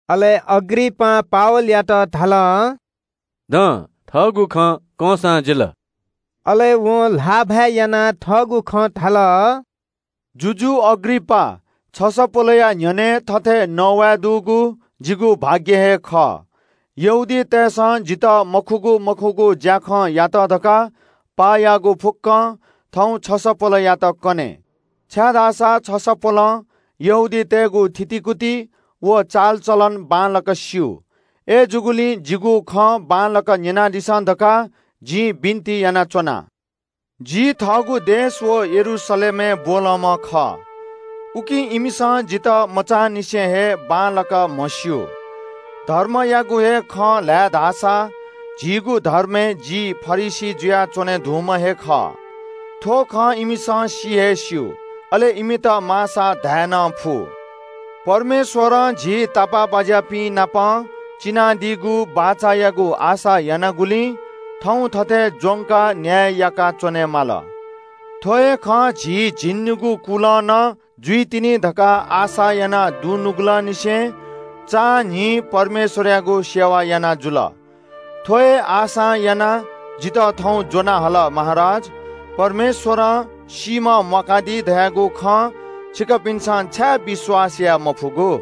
अले अग्रिपासं पावलयात धाल – “दँ, थःगु खँ कंसां जिल।” अले वं ल्‍हाःभाय् यानाः थःगु खँ धाल – “जुजु अग्रिपास, छसपोलया न्‍ह्यःने थथे नवाये दुगुलिं जि तसकं लय्‌ता। यहूदीतय्‌सं जितः मखुगु मखुगु ज्‍याखँयात धकाः पाः याःगु फुक्‍कं थौं छसपोलयात कने, छाय्‌धाःसा छसपोलं यहूदीतय्‌गु थितिकुति व चालचलन बांलाक स्‍यू। अय्‌जूगुलिं जिगु खँ बांलाक न्‍यनादिसँ धकाः जिं बिन्‍ति यानाच्‍वना।” “जि थःगु देश व यरूशलेमय् ब्‍वलंम्‍ह खः। उकिं इमिसं जितः मचांनिसें हे बांलाक म्‍हस्‍यू। धर्मयागु हे खँ ल्‍हाये धाःसा झीगु धर्मय् जि फरिसी जुयाच्‍वने धुंम्‍ह हे खः। थ्‍व खँ इमिसं सि हे स्‍यू, अले इमित माःसा धाये नं फु। परमेश्‍वरं झी तापाःबाज्‍यापिन्‍त बियादीगु वचनय् आशा यानागुलिं थौं थथे ज्‍वंकाः न्‍याय याका च्‍वनेमाल। थ्‍व हे खँ झी झिंनिगू कुलं नं जुइतिनि धकाः आशा यानाः दुनुगलंनिसें चां न्‍हिं परमेश्‍वरयागु आराधना याना जुल। थ्‍व हे आशां यानाः जितः थौं ज्‍वना हल, महाराज। परमेश्‍वरं सीम्‍ह म्‍वाकादी धयागु खँ छिकपिन्‍सं छाय् विश्‍वास याये मफुगु?”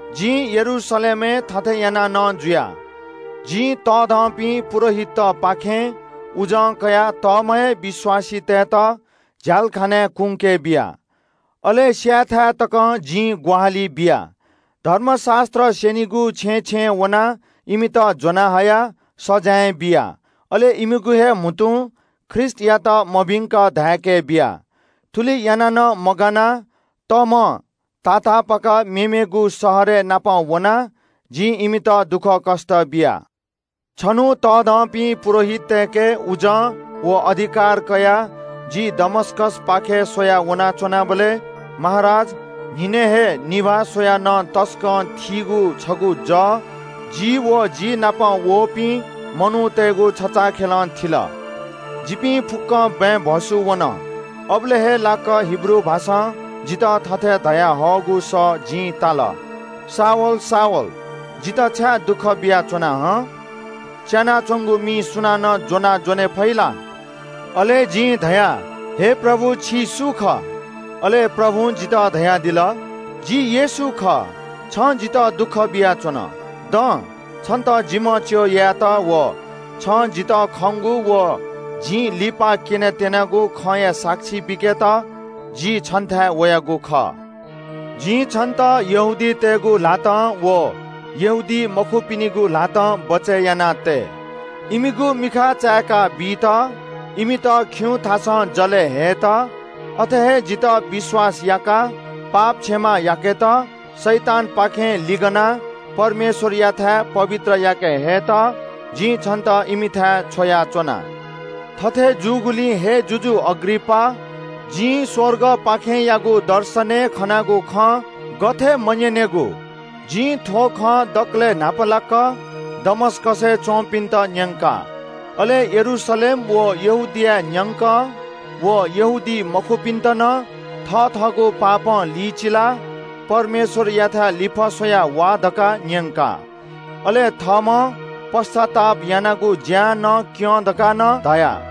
जिं यरूशलेमय् थथे याना नं जुया। जिं तःधंपिं पुजाहारीतपाखें अधिकारया पौ कयाः तःम्‍ह हे विश्‍वासीतय्‌त झ्‍यालखानाय् कुंके बिया। अले स्‍यायेथाय् तकं जिं ग्‍वाहालि बिया। धर्मशास्‍त्र स्‍यनिगु छेँय् छेँय् वनाः इमित ज्‍वनाहयाः सजाँय बिया, अले इमिगु हे म्‍हुतुं ख्रीष्‍टयात मभिंक धाय्‌के बिया। थुलि याना नं मगानाः तमं तातापाक मेमेगु शहरय् नापं वनाः जिं इमित दुःखकष्‍ट बिया।” “छन्‍हु तःधंपिं पुजाहारीतय्‌के उजं व अधिकार कयाः जि दमस्‍कसपाखे स्‍वयाः वनाच्‍वनाबलय् महाराज, न्‍हिनय् हे निभाः स्‍वयाः नं तसकं थीगु छगू जः जि व जि नाप वःपिं मनूतय्‌गु छचाःखेलं थिल। जिपिं फुक्‍कं बँय् भ्‍वसू वन। अबलय् हे लाक्‍क हिब्रू भाषां जितः थथे धयाहःगु सः जिं ताल – ‘शाऊल, शाऊल, जितः छाय् दुःख बियाच्‍वना हं? च्‍यानाच्‍वंगु मि सुनानं ज्‍वनां ज्‍वने फइ ला?’ “अले जिं धया – ‘हे प्रभु, छि सु खः?’ “अले प्रभुं जितः धयादिल – ‘जि येशू खः। छं जितः दुःख बियाच्‍वन। दँ, छन्‍त जिम्‍ह च्‍यः यायेत व छं जितः खंगु व जिं लिपा क्‍यनेत्‍यनागु खँया साक्षी बीकेत जि छन्‍थाय् वयागु खः। जिं छन्‍त यहूदीतय् नायःतय्‌गु ल्‍हातं व यहूदीमखुपिनिगु ल्‍हातं बचय् यानातये। इमिगु मिखा चाय्‌का बीत, इमित खिउँथासं जलय् हयेत, अथे हे जितः विश्‍वास याकाः पाप क्षमा याकेत, शैतानपाखें लिगनाः परमेश्‍वरयाथाय् पवित्र याके हयेत जिं छन्‍त इमिथाय् छ्वयाच्‍वना।’” “थथे जूगुलिं हे, जुजु अग्रिपास, जिं स्‍वर्गपाखेंयागु दर्शनय् खनागु खँ गथे मन्‍यनेगु? जिं थ्‍व खँ दकलय् न्‍हापालाक दमस्‍कसय् च्‍वंपिन्‍त न्‍यंका। अले यरूशलेम व यहूदियाय् न्‍यंकं व यहूदीमखुपिन्‍त नं थथःगु पापं लिचिलाः परमेश्‍वरयाथाय् लिफः स्‍वयाः वा धकाः न्‍यंका। अले थःम्‍हं पश्‍चाताप यानागु ज्‍यां नं क्‍यँ धकाः नं धया।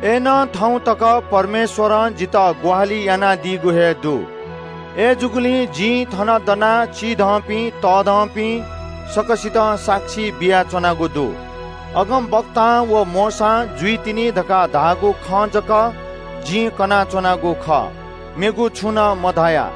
अय्‌नं थौं तक परमेश्‍वरं जितः ग्‍वाहालि यानादीगु हे दु। अय्‌जूगुलिं जिं थन दनाः चिधंपिं, तःधंपिं, सकसितं साक्षी बियाच्‍वनागु दु। अगमवक्तां व मोशां जुइतिनि धकाः धाःगु खँ जक जिं कनाच्‍वनागु खः, मेगु छुं नं मधया।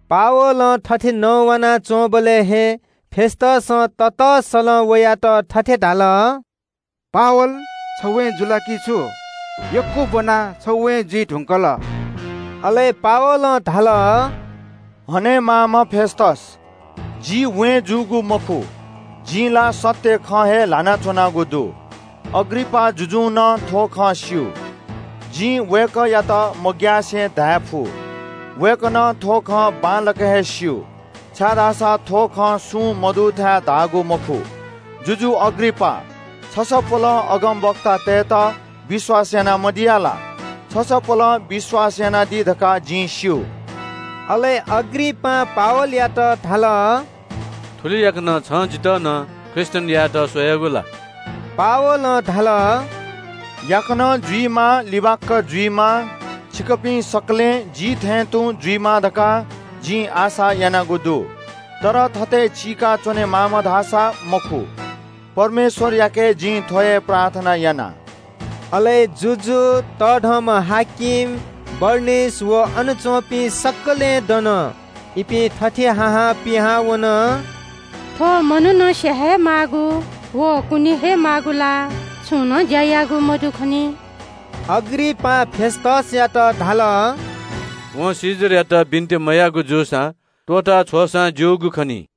पावलं थथे नवानाच्‍वंबलय् हे फेस्‍तसं ततःसलं वयात थथे धाल – “पावल, छ वें जुल ला कि छु? यक्‍व ब्‍वनाः छ वें जुइ धुंकल।” अले पावलं धाल – “हनेमाःम्‍ह फेस्‍तस, जि वें जूगु मखु। जिं ला सत्‍य खँ हे ल्‍हाना च्‍वनागु दु। अग्रिपास जुजुं नं थ्‍व खँ स्‍यू। जिं वय्‌कःयात मग्‍यासे धायेफु। वय्‌कलं थ्‍व खँ बांलाक हे स्‍यू, छाय्‌धाःसा थ्‍व खँ सुं मदुथाय् धाःगु मखु। जुजु अग्रिपास, छसपोलं अगमवक्तातय्‌त विश्‍वास याना मदिया ला? छसपोलं विश्‍वास यानादी धकाः जिं स्‍यू।” अले अग्रिपासं पावलयात धाल – “थुलि याकनं छं जितः नं ख्रीष्‍टियन यायेत स्‍वयागु ला?” पावलं धाल – “याकनं जुइमा, लिबाक्‍क जुइमा, छिकपिं सकलें जि थें तुं जुइमा धकाः जिं आशा यानागु दु। तर थथे सिखलं चीका च्‍वनेमाःम्‍ह धाःसा मखु। परमेश्‍वरयाके जिं थ्‍व हे प्रार्थना याना।” अले जुजु, बडा-हाकिम, बरनिकी व अन च्‍वंपिं सकलें दन। इपिं थथे हा हां पिहां वन – “थ्‍व मनुखं स्‍याये हे माःगु व कुने हे माःगु ला छुं नं ज्‍या याःगु मदु खनी।” अग्रिपासं फेस्‍तसयात धाल – “वं कैसरयात बिन्‍ति मयाःगु जूसा त्‍वःता छ्वःसां ज्‍यूगु खनी।”